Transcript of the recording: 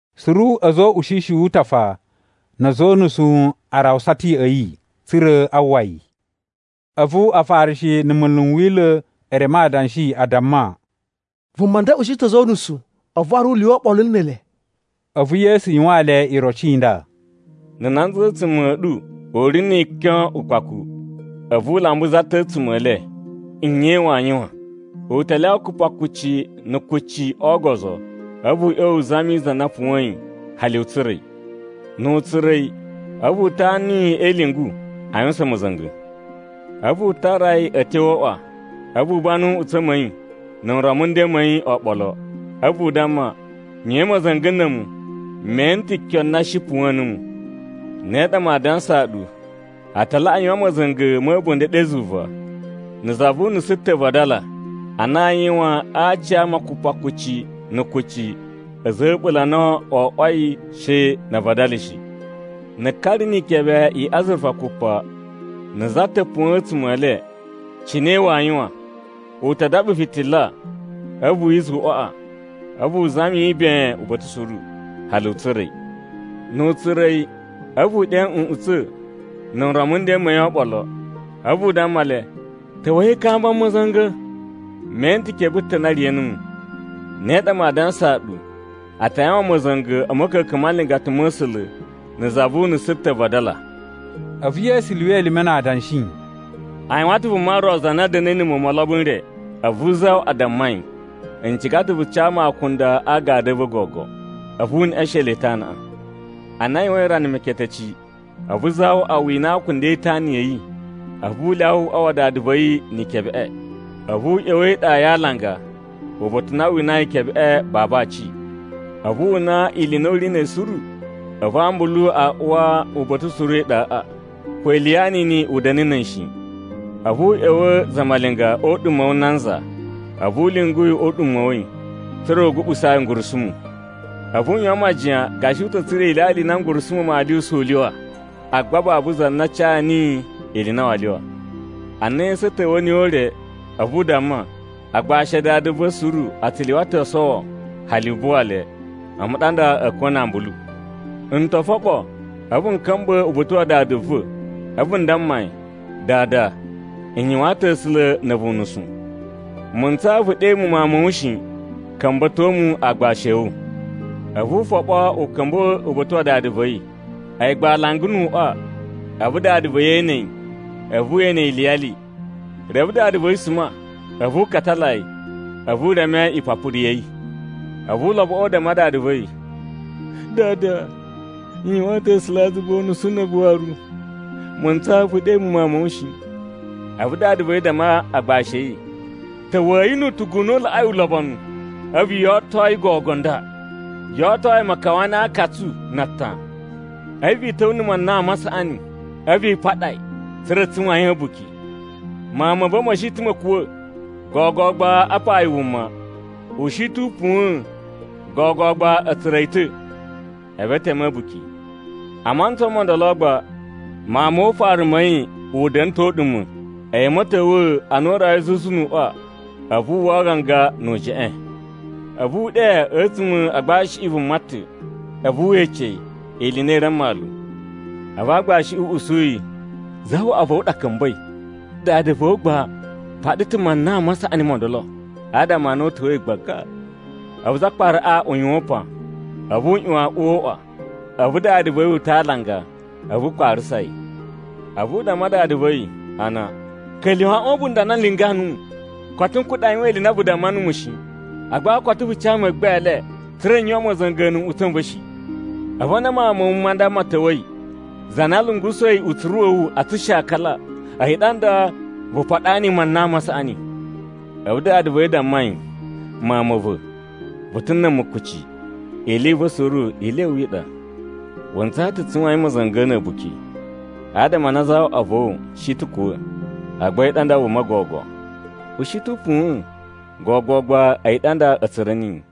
Suru a̱za̱ o uꞌushishi wu utafa na̱ a̱za̱ o unusu a rawusa ta̱ ya̱ꞌa̱ yi, tsa̱ra̱ a uwwa yi. A̱vu Afarishi na̱ munlu n Wila̱ e reme adanshi, a damma, “Vuma nda ushi ta̱ a̱za̱ o unusu, a̱vu waru u lyuwa oɓolo ne ele.” A̱vu Yesu yuwaan le iroci i nda: “Na̱ nanza a̱tsuma̱ a̱ ɗu u ri ni ikyon ukpaku, a̱vu u lamba za ta̱ a̱tsuma̱ e le, nye waa yuwan? U ta lyawa kupakucci na̱ kucci o ogozo, a̱vu u ꞌya̱wa̱ u zami za na puwa̱yin hali u tsura̱ yi. Nu u tsura̱ yi, a̱vu u tanu yi e ilyungu a yuwusan ma̱za̱nga̱. A̱vu u tara yi a̱ ta̱wa̱ o uꞌwa. A̱vu u banu nꞌutsa̱ ma̱ yi na̱ nron mu nden ma̱ yi oɓolo, a̱vu u damma, ‘Yuwain ma̱za̱nga̱ na̱ a̱mu, me ene ta̱ kyon na shi puwa̱a̱n nuwu.’ Ne ɗa maa dansaa ɗu, a ta laꞌa yuwan ma̱za̱nga̱ ma̱ a̱bunda̱ ɗe zuva, na̱ za vu unusu ta̱ vadala, a na aa yuwan a aci ama kupakucci na̱ kucci a̱za̱ a̱ a̱ɓula̱ a na wo oꞌwoi she na a vadala shi. “Na̱ ka ri ni ikebe i azurufa kupa, na̱ za ta̱ puwa̱a̱n a̱tsuma̱ e le, cine waa yuwan? U ta daɓa fitila, a̱vu wi iza̱ uꞌwaꞌa, a̱vu u zami yi ben uba̱ta̱ suru, hali u tsura̱ yi. Nu u tsura̱ yi, a̱vu u ɗe nꞌutsa̱ na̱ nron mu nden ma̱ yi oɓolo, a̱vu u damma le, ‘Ta̱wa̱i i kamba mu ma̱za̱nga̱! Me ene ta̱ kebe ta̱ na riya̱ numu.’ Ne ɗa maa dansaa ɗu, a ta yuwan ma̱za̱nga̱ a̱ ma̱ka̱ka̱n ma nlingata ma̱ A̱sula̱ na̱ za vu unusu ta̱ vadala.” A̱vu Yesu lyuwa elime na adanshi, “A yuwan ta̱ vuma ro za na da̱na̱i na̱ muwun mo olobo n re. A̱vu zawaꞌa damma yi, ‘N ciga ta̱ vu ca mu akunda a agadu a̱ va̱ gogo.’ A̱vu u neꞌeshen le itanaꞌa. “Ana a yuwain rana meketeci, a̱vu zawaꞌa wina akunda e itana ya̱ yi, a̱vu u lyawa uꞌwa wa dada va̱ yi ni ikebeꞌe. A̱vu u ꞌya̱wa̱ e iɗa ya alanga, uba̱ta̱ u na wu unai ikebeꞌe babu aci. A̱vu wu una ili i na u ri na̱ yi suru. A̱vu ambulu a uwa uba̱ta̱ suru e iɗaꞌa, ko ili ya anini u da̱na̱ na̱ yi shi. A̱vu u ꞌya̱wa̱ zamalinga o uɗuma̱ wu nanza. A̱vu u lyungu yi o uɗuma̱ wa̱ yi, tsa̱ra̱ u guɓusaa yi ngurusumu. A̱vu u yuwan majiyan gashi u ta̱ tsura̱ ilyalya i na ngurusumu maa lyuwusa u lyuwa, agba babu za na ca niyi ili i na waa lyuwa. “Ana esu a̱ ta̱wa̱ niyi o ure, a̱vu u damma, ‘Agbashi a dada va̱ suru a tsu lyuwa ta̱ o sowo hali u buwa le. A̱mu ɗa nda a̱ kuwa̱ na ambulu. N to foɓo, a̱vu n ka̱mba̱ uba̱ta̱ wa dada va̱, a̱vu n damma yi, “Dada, n yuwaan ta̱ A̱sula̱ na̱ a̱vu unusu. Mu ntsaa vu ɗe mu mawun ma̱ wu shi, ka̱mba̱to mu aagbashi a̱ wu.” ’ A̱vu u foɓo u ka̱mba̱ uba̱ta̱ wa dada va̱ yi. “A̱yi gba alanga nu uꞌwa, a̱vu dada va̱ yi ene yi, a̱vu we ene yi iliyali. Reve dada va̱ yi suma, a̱vu u katala yi, a̱vu u reme ipapuru ya̱ yi. “A̱vu uloboꞌo u damma dada va̱ yi, ‘Dada, n yuwaan ta̱ A̱sulazuva unusu na̱ a̱vu waru. Mu ntsaa vu ɗe mu mawun ma̱ wu shi.’ “A̱vu dada va̱ yi damma agbashi a̱ yi, ‘Ta̱wa̱yi nu utugu u na u laꞌai ulobonu, a̱vu yo oto yi gogo nda. Yo oto yi makawani a aakatsu na atan. A̱vu i ta̱wa̱ na̱ manan ma saꞌani, a̱vu i paɗa yi, tsa̱ra̱ tsu yuwain a̱buki. Mawun ma̱ va̱ ma̱ shi ta̱ ma̱ kuwa̱, gogo gba apa yi wuma. U shi ta̱ u puwa̱n, gogo gba a̱ tsura̱ yi ta̱!’ A̱vu e teme a̱buki. “A mantsa mo ndolo gba, mawun mo ufaru ma̱ yi u da̱na̱ ta̱ o uɗuma̱. A̱yi a̱ ma̱ta̱wa̱a̱, ana u rawai zuzu nu uꞌwa, a̱vu wu uwwa aganga nu ujeꞌen. A̱vu u ɗe a̱tsuma̱ a agbashiꞌi vuma ta̱, a̱vu we ece yi ili i na i ri a mmalu. A̱vu aagbashiꞌi u usu yi, ‘Zawaꞌa va̱ wu ɗa ka̱mba̱i, dada va̱ wu gba u paɗa ta̱ manan ma saꞌani mo ndolo, adama a na u ta̱wa̱i gbaga!’ “A̱vu zakparaꞌa u yuwan upan, a̱vu u ꞌyuwan a uwa o uꞌwa. A̱vu dada va̱ yi uta̱ a alanga, a̱vu u kparasa yi. A̱vu u damma dada va̱ yi, a na, ‘Ka̱lyuwa̱ aꞌwan a̱ a̱bunda̱ a na n lingaa nuwu. Koto n kuɗa̱ a yuwan ili i na vu damma numu shi. Agba koto vu ca mu meggbele, tsa̱ra̱ n yuwan ma̱za̱nga̱ na̱ nꞌutsa̱ n va̱ shi. A̱vu ana mawun ma̱ wu ma nda ma̱ ta̱wa̱i, za na lungusa̱i utsuru wa̱ wu a tsushakala, a̱yi ɗa nda, vu paɗa niyi manan ma saꞌani.’ “A̱vu dada va̱ yi u damma yi, ‘Mawun ma̱ va̱, vu ta̱ na̱ a̱mu kuci, ili i va̱ suru ili ya̱ wu i ɗa. Wu ntsaa ta̱ tsu yuwain ma̱za̱nga̱ na̱ a̱buki, adama a na zawaꞌa va̱ wu shi ta̱ u kuwa̱, agba a̱yi ɗa nda wuma gogo. U shi ta̱ u puwa̱n, gogo gba a̱yi ɗa nda a̱ tsura̱ niyi.’”